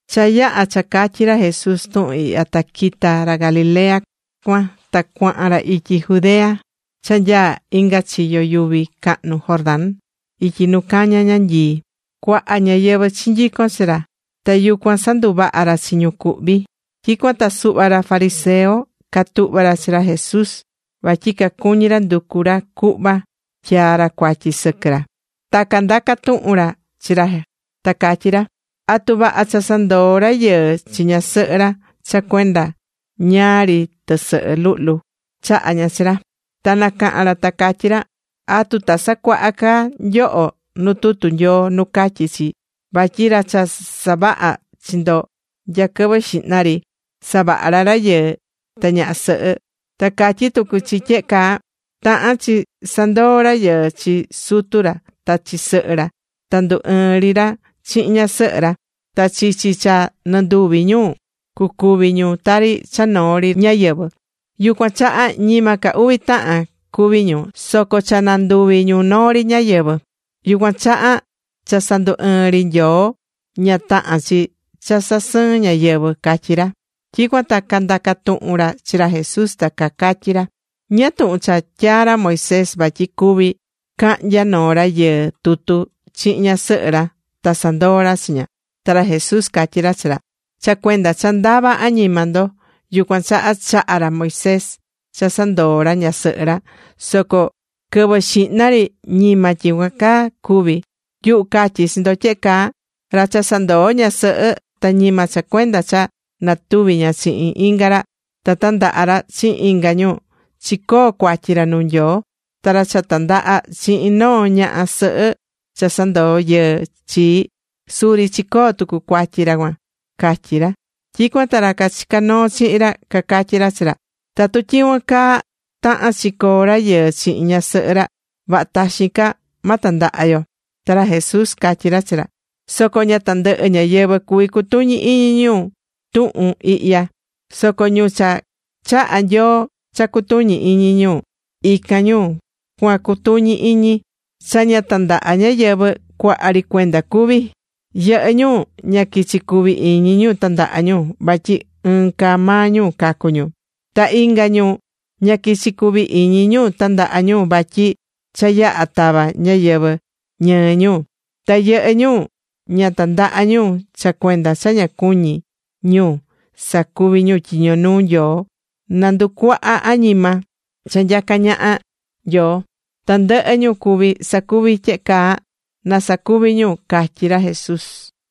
Cha yaha̱ cha catyi̱ ra Jesús tuhun ihya, ta quita̱ ra Galilea cuan, ta cuahan ra ityi Judea cha nyaá inga chiyo yuvi cahnu Jordán, ityi nu caña ñanyii. Cuaha ñáyɨvɨ chinyico̱n chi ra, ta yucuan sanduvaha̱ ra chi ñu cuhvi̱. Tyicuan ta suhva ra fariseo catuhva̱ ra chi ra Jesús, vatyi cacuñí ra nducu ra cuhva tyaa ra cuatyi sɨquɨ ra. Ta candaca̱ tuhun ra chi ra ta catyí ra: ―¿Atu vaha cha sandoo rayɨɨ chi ñasɨhɨ ra cha cuenda ñáá ri tɨsɨhɨ luhlu chaha̱ ña chi ra? Ta nacaha̱n ra ta catyí ra: ―¿Atu ta sacuaha ca nyoho nu tutu Nyoo nu catyí chi vatyi ra cha savaha̱ chi ndo nya quɨvɨ xihna ri, savaha̱ ra rayɨɨ ta ñaha sɨhɨ? Ta catyí tucu chi tyehe caa: “Tahán chi sandoo rayɨɨ chi sutu ra ta chi sɨhɨ ra, ta ndu ɨɨn ri ra chihin ñasɨhɨ ra. Ta chichi cha nɨnduvi ñu, cucuvi ñu tari cha noo ri ñáyɨvɨ.” Yucuan chaha, ñima ca uvi tahan cuví ñu, soco cha nanduvi̱ ñu noo ri ñáyɨvɨ. Yucuan chaha, cha sandu ɨɨ̱n ri Nyoo ña tahán chi cha sasɨɨn ñáyɨvɨ ―catyí ra. Tyicuan ta candaca̱ tuhun ra chi ra Jesús ta cacatyí ra: ―¿Ñáá tuhun cha tyaa̱ ra Moisés vatyi cuví cahnya noo rayɨɨ tutu chihin ñasɨhɨ ra ta sandoo ra chi ña? Ta ra Jesús catyí ra chi ra: ―Cha cuenda cha ndavá añima ndo, yucuan chaha, chaha̱ ra Moisés cha sandoo ra ñasɨhɨ ra. Soco quɨvɨ xihna ri ñima tyicuan caa cuvi̱. Yuhu catyí chi ndo tyehe caa: Ra cha sandoo̱ ñasɨhɨ, ta ñima cha cuenda cha natuvi̱ ña chihin inga ra, ta tandaha̱ ra chihin inga ñu, chicoo̱ cuatyi ra nuu Nyoo. Ta ra cha tandaha chihin noo ñaha sɨhɨ cha sandoo̱ yɨɨ chi, suri chicoo̱ tucu cuatyi ra cuan ―catyí ra. Tyicuan ta ra cachicá noo chihin ra, cacatyí ra chi ra: ―Tatu tyicuan caa tahán chi coo rayɨɨ chihin ñasɨhɨ ra, vaha taxin ca ma tandaha yo. Ta ra Jesús catyí ra chi ra: ―Soco ña tandɨhɨ ñáyɨvɨ cuví cutuñi iñi ñu tuhun ihya. Soco ñu cha chaha̱ Nyoo cha cutuñi iñi, ican ñu cua cutuñi iñi. Cha ña tandaha ñáyɨvɨ, cuaha ri cuenda cuví. Yɨhɨ́ ñu ña quichi cuví iñi ñu tandaha ñu vatyi ɨɨn caa maa ñu cacu ñu. Ta inga ñu ña quichi cuvi iñi ñu tandaha ñu vatyi cha yaha tava ñáyɨvɨ ñɨɨ ñu. Ta yɨhɨ́ ñu ña tandaha̱ ñu cha cuenda cha cuñí ñu sacuvi ñu tyiño nuu Nyoo, na nducuaha añima cha nyacá ñaha Nyoo. Tandɨhɨ ñu cuví sacuvi tyehe caa, na sacuvi ñu ―catyí ra Jesús.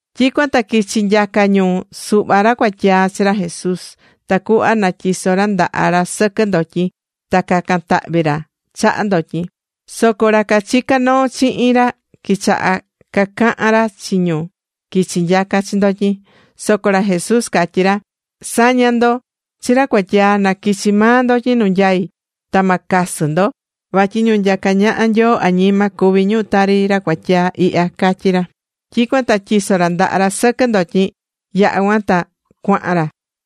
Tyicuan ta quichi̱ nyaca ñu suhva ra cuatyaa chi ra Jesús tacuhva na tyiso ra ndaha ra sɨquɨ ndotyin, ta cacan tahvi ra chaha ndotyin. Soco ra cachicá noo chihin ra quichaha̱ cacahan ra chi ñu quichi̱ nyaca chi ndotyin. Soco ra Jesús catyí ra: ―Sa̱ña ndo chi ra cuatyaa, na quichi maa ndotyin nu nyaí. Ta ma casɨ ndo. Vatyi ñu nyacá ñaha Nyoo añima, cuví ñu tari ra cuatyaa ihya ―catyí ra. Tyicuan ta tyiso̱ ra ndaha ra sɨquɨ ndotyin. Yaha̱ cuan ta cuahan ra.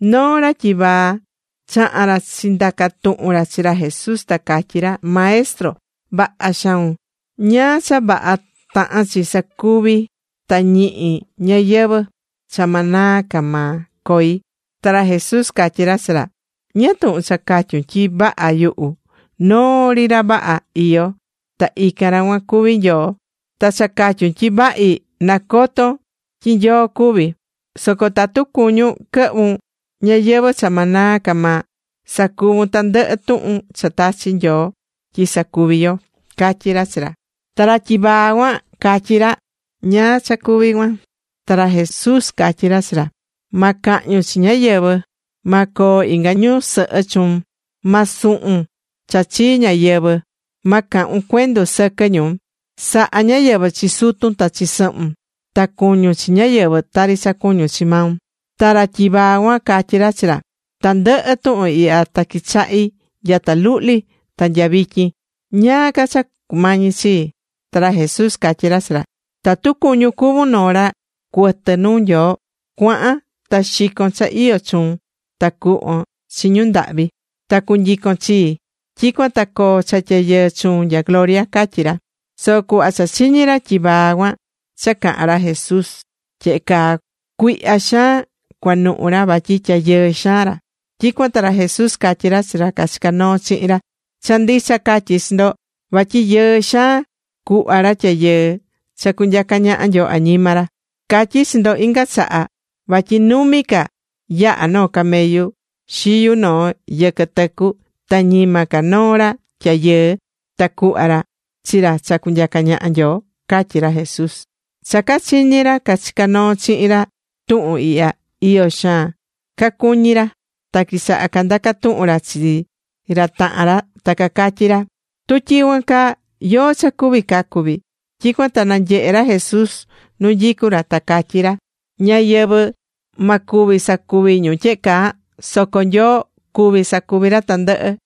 Noo ra tyivaa chaha̱n ra chindaca̱ tuhun ra chi ra Jesús ta catyí ra: ―Maestro vaha xaun. ¿Ñáá cha vaha tahán chi sacuvi ta ñihi ñayɨvɨ̱ cha ma naa ca maa coi? Ta ra Jesús catyí ra chi ra: ―¿Ñáá tuhun cha catyun tyi vaha yuhu? Noo ri ra vaha iyó ta ican ra cuan cuví Nyoo. [Ta cha catyun tyi vahi, nacotón tyi Nyoo cuvi.] Soco tatu cuñún quɨhvun ñayɨvɨ̱ cha ma naa ca maa, sa̱cuvun tandɨhɨ tuhun cha tachi̱ Nyoo tyi sacuvi yo ―catyí ra chi ra. Ta ra tyivaa cuan catyí ra: ―¿Nya cha cuví cuan? Ta ra Jesús catyí ra chi ra: ―Ma cahñun chi ñáyɨvɨ. Ma coo inga ñusɨhɨ chuun. Ma suhun cha chii ñáyɨvɨ. Ma cahun cuendu sɨquɨ ñu. Sa̱ha ñáyɨvɨ chi sutun ta chi sɨhun. Ta cu̱ñun chi ñáyɨvɨ, tari cha cuñún chi maun. Ta ra tyivaa cuan, catyí ra chi ra: ―Tandɨhɨ tuhun ihya ta quichahí nyata luhli ta nya vityin. ¿Ñáá ca cha cumañí chii? Ta ra Jesús catyí ra chi ra: ―Tatu cuñún cuvun noo ra cuɨtɨ nuu Nyoo, cua̱han ta xi̱con cha iyó chuun, ta cu̱hvon chi ñu ndahvi, ta cu̱nyicon chii. Tyicuan ta coo cha tyayɨɨ chuun nya gloria ―catyí ra. Soco cuhva cha chiñi̱ ra tyivaa cuan cha caha̱n ra Jesús tyehe caa, cuihya xaan cuanuhu ra vatyi tyayɨɨ xaan ra. Tyicuan ta ra Jesús catyí chi ra cachicá noo chihin ra: ―Cha ndicha catyí chi ndo vatyi yɨɨ xaan cuhva ra tyayɨɨ cha cunyaca ñaha Nyoo añima ra. Catyí chi ndo inga chaha, vatyi numi ca yaha noo camellu xiyu noo yɨquɨ tɨcu, ta ñima ca noo ra tyayɨɨ ta cuhva ra chi ra cha cunyaca ñaha Nyoo ―catyí ra Jesús. Cha cachiñi̱ ra cachicá noo chihin ra tuhun ihya, iyo xaan cacuñi̱ ra, ta quichaha̱ candaca tuhun ra chi ra tahan ra, ta cacatyí ra: ―Tu tyicuan caa, ¿yóó cha cuví cacu vii? Tyicuan ta nanyehe̱ ra Jesús nu nyicú ra ta catyí ra: ―Ñáyɨvɨ ma cuvi sacuvi ñu tyehe caa, soco Nyoo cuví sacuvi ra tandɨhɨ.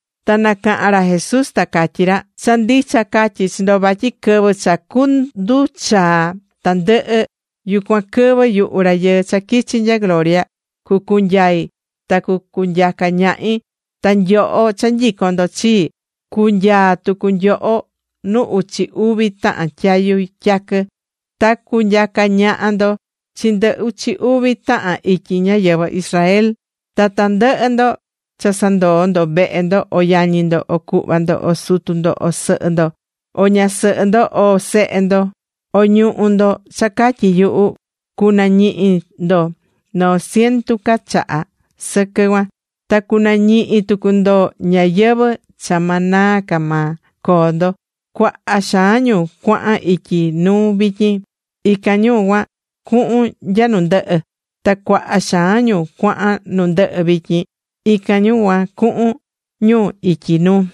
Ta nacaha̱n ra Jesús ta catyí ra: ―Cha ndicha catyí chi ndo, vatyi quɨvɨ cha cunduchaa tandɨhɨ, yucuan quɨvɨ yuhu Rayɨɨ cha quichi̱ nya gloria cucunyai ta cunyaca ñahi, ta nyoho cha nyicón ndo chii, cunyaa tucu nyoho nu uchi uvi tahan tyayu tyaquɨ. Ta cunyaca ñaha ndo chi ndɨ uchi uvi tahan ityi ñáyɨvɨ Israel. Ta tandɨhɨ ndo cha sandoo̱ ndo vehe ndo, o yañi ndo, o cuhva ndo, o sutu ndo, o sɨhɨ ndo, o ñasɨhɨ ndo o sehe ndo, o ñuhú ndo cha catyí yuhu, cunañihi ndo noo cientu ca chaha sɨquɨ cuan, ta cunañihi tucu ndo ñayɨvɨ̱ cha ma naa ca maa coo ndo. Cuaha xaan ñu cuahan ityi nuu vityin, ican ñu cuan, cuhun nya nu ndɨhɨ. Ta cuaha xaan ñu cuahan nu ndɨhɨ vityin, ican ñu cuhun ñu ityi nuu.